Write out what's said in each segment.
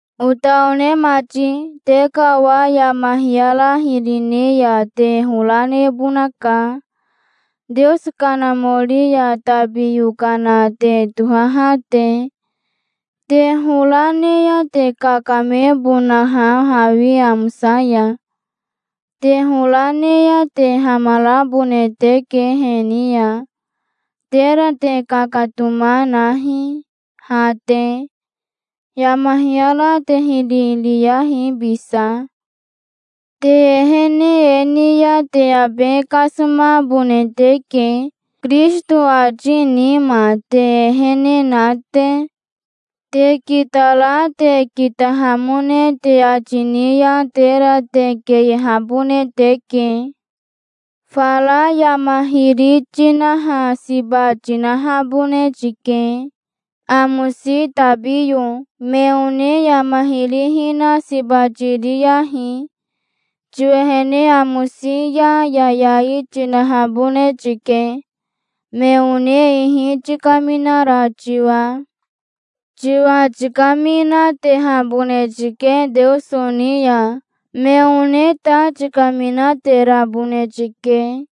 Ota one mati, te ka owa yama hiyara hiri ne ya te hora nebonaka, Teoso Kanamori ya tabi yokana te tohaha te, te hora ne ya te kakamebonaha hawi amosa ya. Te hora ne ya te hamarabone teke he ni ya. Tera te kakatoma nahi, ha te. Yama hiyara te hiri riyahi bisa. Te ehene e ni ya te abe kasomabone teke, Kirisito ati nima te ehene na te. Te kitara te kitahamone te ati ni ya tera te keyehabone teke. Fara yama hiri tinaha siba tinahabone tike, amosi tabiyo. Me one yama hiri hina siba tiriyahi. Tiwehene amosi ya yayai tinahabone tike, me one ihi tikaminara tiwa. Tiwa tikaminatehabone tike Teoso ni ya. Me one ta tikaminaterabone tike.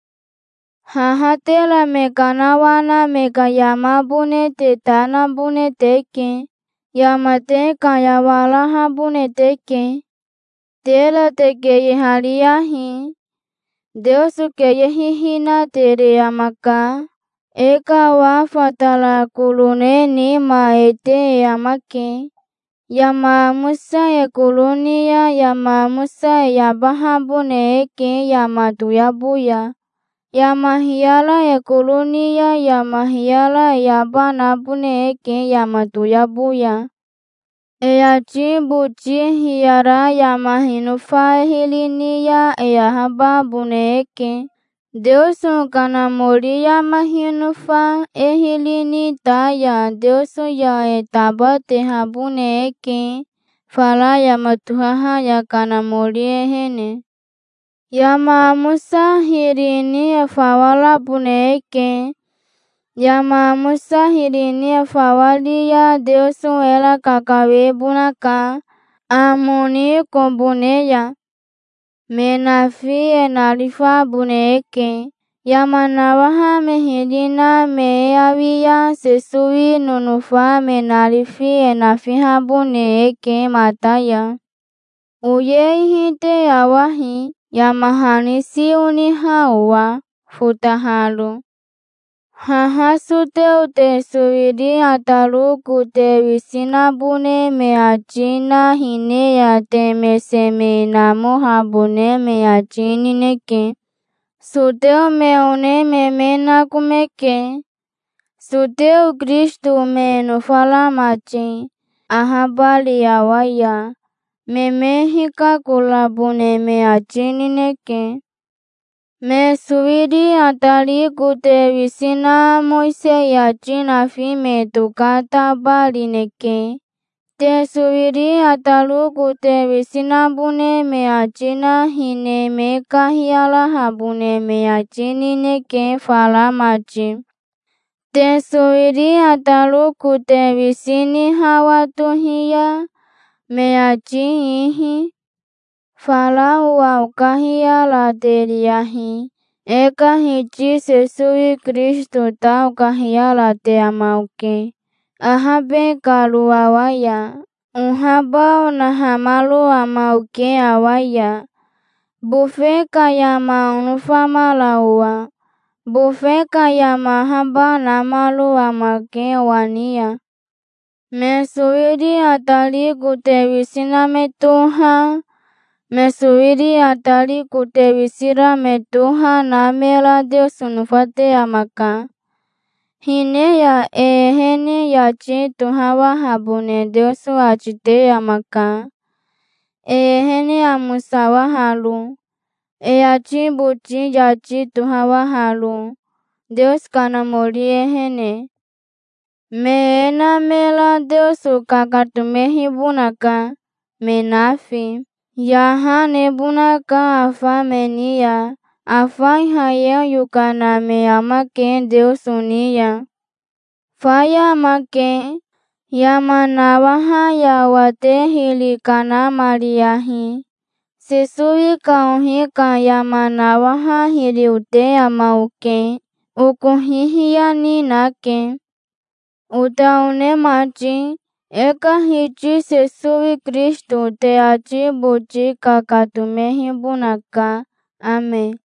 Haha tera me kanawana me ka yamabone te ta nabone teke. Yama te kayawarahabone teke. Tera te keyehariyahi. Teoso keyehihinatere amaka. E ka owa fatara koro ne nima e te e amake. Yama amosa e koro ni ya yama amosa e yabahabone eke yama toyabo ya. Yama hiyara e koro ni ya yama hiyara e yaba nabone eke yama toyabo ya. E ati boti hiyara yama hinofa e hiri ni ya e ahababone eke. Teoso Kanamori yama hinofa e hiri ni ta ya Teoso ya e tabatehabone eke fara yama tohaha ya Kanamori ehene. Yama amosa hiri ni e fawa rabone eke. Yama amosa hiri ni e fawa ri ya Teoso era kakawebonaka, amo ni kobo ne ya. Me nafi e narifabone eke, yama nawaha me hiri na me e awi ya. Sesowi nonofa me narifi e nafihabone eke mata ya. Oye ihi te awahi, yama hani si oniha owa, fotaharo. Haha soteo te sowiri ataro kote wisi nabone me ati na hine ya te mese me namohabone me ati nineke. Soteo me one me me nakomeke, soteo Kirisito me nofara mati, ahabari awa ya. Me me hikakorabone me ati nineke. Me sowiri atari kote wisi na Mowisei ati nafi me tokatabarineke. Te sowiri ataro kote wisi nabone me ati na hine me kahiyarahabone me ati nineke fara mati, te sowiri ataro kote wisi ni hawa tohi ya, me ati ihi. Fara owa okahiyarateriyahi. E ka Hiti Sesowi Kirisito ta okahiyarate ama oke, ahabe karo awa ya. Ohaba onahamaro ama oke awa ya, bofe ka yama onofamara owa. Bofe ka yama ahaba namaro amake owa ni ya. Me sowiri atari kote wisi na me toha, me sowiri atari kote wisi ra me toha na mera Teoso nofate amaka. Hine ya e ehene yati tohawahabone Teoso ati te amaka, e ehene amosawaharo, e ati boti yati tohawaharo, Teoso Kanamori ehene. Me e na mera Teoso kakatomehibonaka, me nafi. Yaha nebonaka afa me ni ya. Afa Ihayeo yokana me amake Teoso ni ya. Faya amake. Yama nawaha ya owa te hiri kanamariyahi. Sesowi ka ohi ka yama nawaha hiri ote ama oke. Oko hihiya ni nake. Ota one mati, e ka Hiti Sesowi Kirisito te ati boti kakatomehibonaka. Ame.